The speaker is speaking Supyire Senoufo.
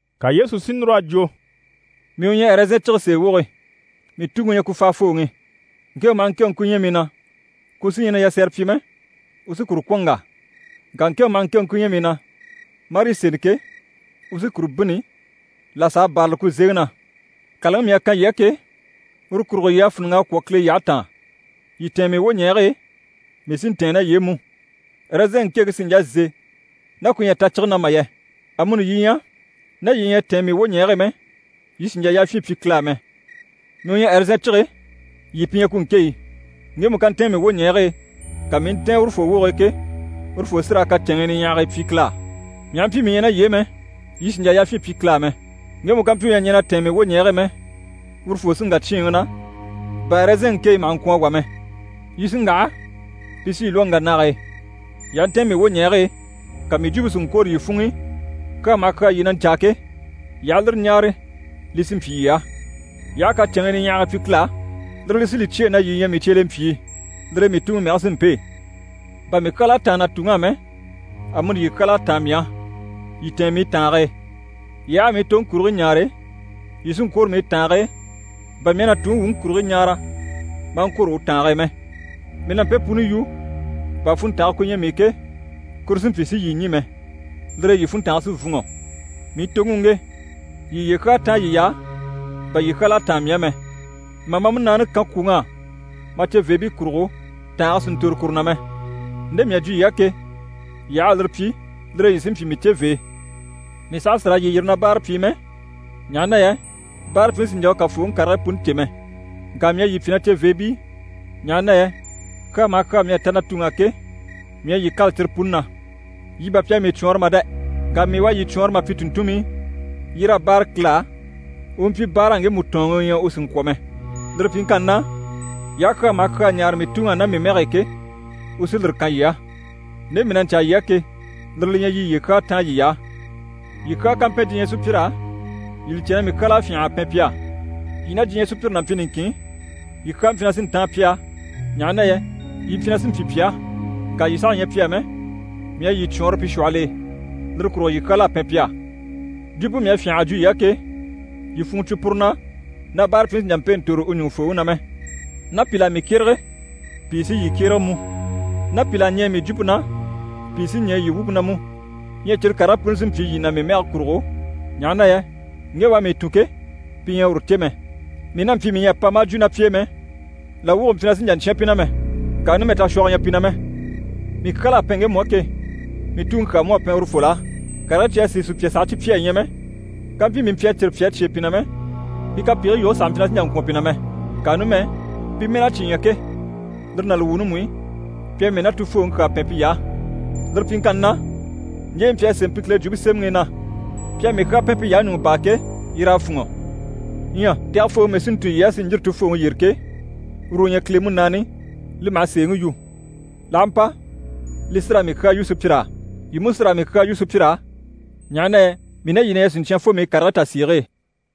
Ka Yesu si núr'a jwo: «Mii u ɲyɛ ɛrɛzɛn cige sèe woge, mii Tuŋi u ɲyɛ ku faafooŋi. Ŋkéŋɛ maha ŋkéŋɛ ku ɲyɛ mii na, ku sí ɲyɛ na yasɛrɛ pyi mɛ, u sí kuru kwɔ̀n n‑wà. Ŋka ŋkéŋɛ maha ŋkéŋɛ ku ɲyɛ mii na, marii seni ke, u sí kuru bînni, là s'a bârali ku zeŋi na. Kàlaŋi mii à kan yii á ke, uru kurugo yii à fíniŋ'a kwɔ̀ Kile yyahe taan. Yii tɛ̀ɛn mii wwoɲɛɛge e, mii sí n‑tɛ̀ɛn ná yii e mú. Ɛrɛzɛnŋi ŋkéŋke sì n‑jà n‑se ná ku ɲyɛ a ta cige na mà yɛ. Amuni yii ɲyɛ, ná yii ɲyɛ a tɛ̀ɛn mii wwoɲɛɛge e mɛ, yii sì n‑jà yafyin pyi Kile a mɛ. Mii u ɲyɛ ɛrɛzɛn cige, yii pi ɲyɛ ku ŋkéɲyi. Ŋgemu ká ntɛ̀ɛn mii wwoɲɛɛge e, ka mii i ntɛ̀ɛn urufoo woge e ke, urufoo sí raa kacɛnŋii niɲyahagii pyi Kile á. Mii aha mpyi mii ɲyɛ ná yii e mɛ, yii sì n‑jà yafyin pyi Kile á mɛ. Ŋgemu ká mpyi u ɲyɛ a ɲɛn'a tɛ̀ɛn mii wwoɲɛɛge e mɛ, urufoo sí n‑wà cyíinŋi na, bà ɛrɛzɛnŋi ŋkéɲyi maha ŋkwɔ̀n a wà mɛ. Yi sí n‑waha, pi sí yi lwɔ́ n‑wà nage e. Yii aha ntɛ̀ɛn mii wwoɲɛɛge e, ka mii jwumpe si ŋkwôro yii funŋ'i, kyaa maha kyaa yii na ɲcaa ke, yii aha lire ɲáare, li sí n‑pyi yii á. Yii aha kacɛnŋii niɲyahagii pyi Kile á, lire li sí li cyêe na yii ɲyɛ mii cyelempyii. Lire e mii Tuŋi mɛge sí n‑pêe. Bà mii kyal'à táan na Tuŋi á mɛ, amuni yii kyal'à táan mii á. Yii tɛ̀ɛn mii tàange e. Yii aha a mii toŋi kurigii ɲaare, yii sí n‑kwôro mii tàange e, bà mii à na Tuŋi wuŋi kurigii ɲaara maa ŋkwôro u tàange e mɛ. Mii na mpe puni yu bà funntange ku ɲyɛ mii i ke, kuru si mpyi si yii ɲî mɛ. Lire e yii funntange sí n‑fûnŋɔ. Mii toŋi u ŋge: yii yiye kyaa táan yiy'á, bà yii kyal'à táan mii á mɛ. Mà ma múnaani kan kwùŋ'á ma ceveebii kurugo, tàange sì n‑tòro kuru na mɛ. Nde mii à jwo yii á ke, yii aha a lire pyi, lire e yii sí n‑pyi mii cevee. Mii saha sì raa yii yiri na báarapyii mɛ, ɲaha na yɛ báarapyiŋi sì n‑jà u kàfooŋi karigii puni cè mɛ. Ŋka mii à yii pyi na ceveebii, ɲaha na yɛ kyaa maha kyaa mii à ta na Tuŋi á ke, mii à yii kâla cyire puni na. Yii bà pi à mii cwɔɔnrɔ mà dɛ! Ŋka mii u à yii cwɔɔnrɔ mà pyi tùnntunmii, yii raa báare Kile á, u u mpyi báara ŋgemu tɔ̀ɔnŋi u ɲyɛ u sì n‑kwɔ̀ mɛ. Lire pyiŋkanni na, yii aha kyaa maha kyaa ɲáare mii Tuŋi á ná mii mɛge e ke, u sí lire kan yii á. Nde mii na ɲcaa yii á ke, lire li ɲyɛ yii yiye kyaa táan yiy'á.» «Yii kyaa ká mpɛn diɲyɛ sùpyir'á, yii li cè na mii kyal'à fyânha a pɛn pi á. Yii ná diɲyɛ sùpyire n'a mpyi niŋkin, yii kyaa mpyi na sí n‑táan pi á, ɲaha na yɛ yii mpyi na sí n‑pyi pi á. Ŋka yii saha ɲyɛ pi á mɛ, mii à yii cwɔɔnrɔ pi shwɔhɔl'e. Lire kurugo yii kyal'à pɛn pi á. Jwumpe mii à fyânha a jwo yii á ke, yii funŋke cwo puru na na báarapyiŋi sì n‑jà n‑pêe n‑tòro u ɲùŋufooŋi na mɛ. Ná pìl'à mii kyérege, pìi sí yii kyérege mú. Ná pìl'à ɲɛɛ mii jwumpe na, pìi sí ɲɛɛ yii wumpe na mú. Ɲyɛ cyire karigii puni sí n‑pyi yii na mii mɛge kurugo, ɲaha na yɛ ŋge u à mii tun ke, pi ɲyɛ a uru cè mɛ. Mii n'a mpyi mii ɲyɛ a pa maa jwo ná pi e mɛ, làwwugo mpyi na sì n‑jà n‑cyán pi na mɛ. Ŋka numɛ tashwɔgɔ ɲyɛ pi na mɛ. Mii kyal'à pɛn ŋgemu á ke, mii Tuŋi kyaa mú à pɛn urufol'á. Karigii cyi à sìi sùpya sàha cyi pyi a ɲya mɛ, kàmpyi mii mpyi a cyire pyi a cyêe pi na mɛ, pi kapegigii yoge sàha mpyi na sì n‑jà n‑kwɔ̀n pi na mɛ. Ŋka numɛ, pi mɛ́n'à cyi ɲya ke, lire ná li wuuni mú i, pi à mii ná Tufooŋi kyaa pɛn piy'á. Lire pyiŋkanni na, ɲje yi mpyi a sémɛ pi Kile Jwumpe Semɛŋi i na “Pi à mii kyaa pɛn piy'á ɲùŋɔ baa” ke, yir'à fûnŋɔ. Ɲyɛ Tɛgɛfooŋi mii sí n‑tun yii á, si ɲjîri Tufooŋi yyére ke, uru u ɲyɛ Kile Munaani, li maha sèeŋi yu. L'aha mpa, li sí raa mii kyaa yu sùpyir'á. Yii mú sí raa mii kyaa yu sùpyir'á, ɲaha na yɛ mii ná yii na ɲyɛ siɲcyan fo mii karigii tasiige e.»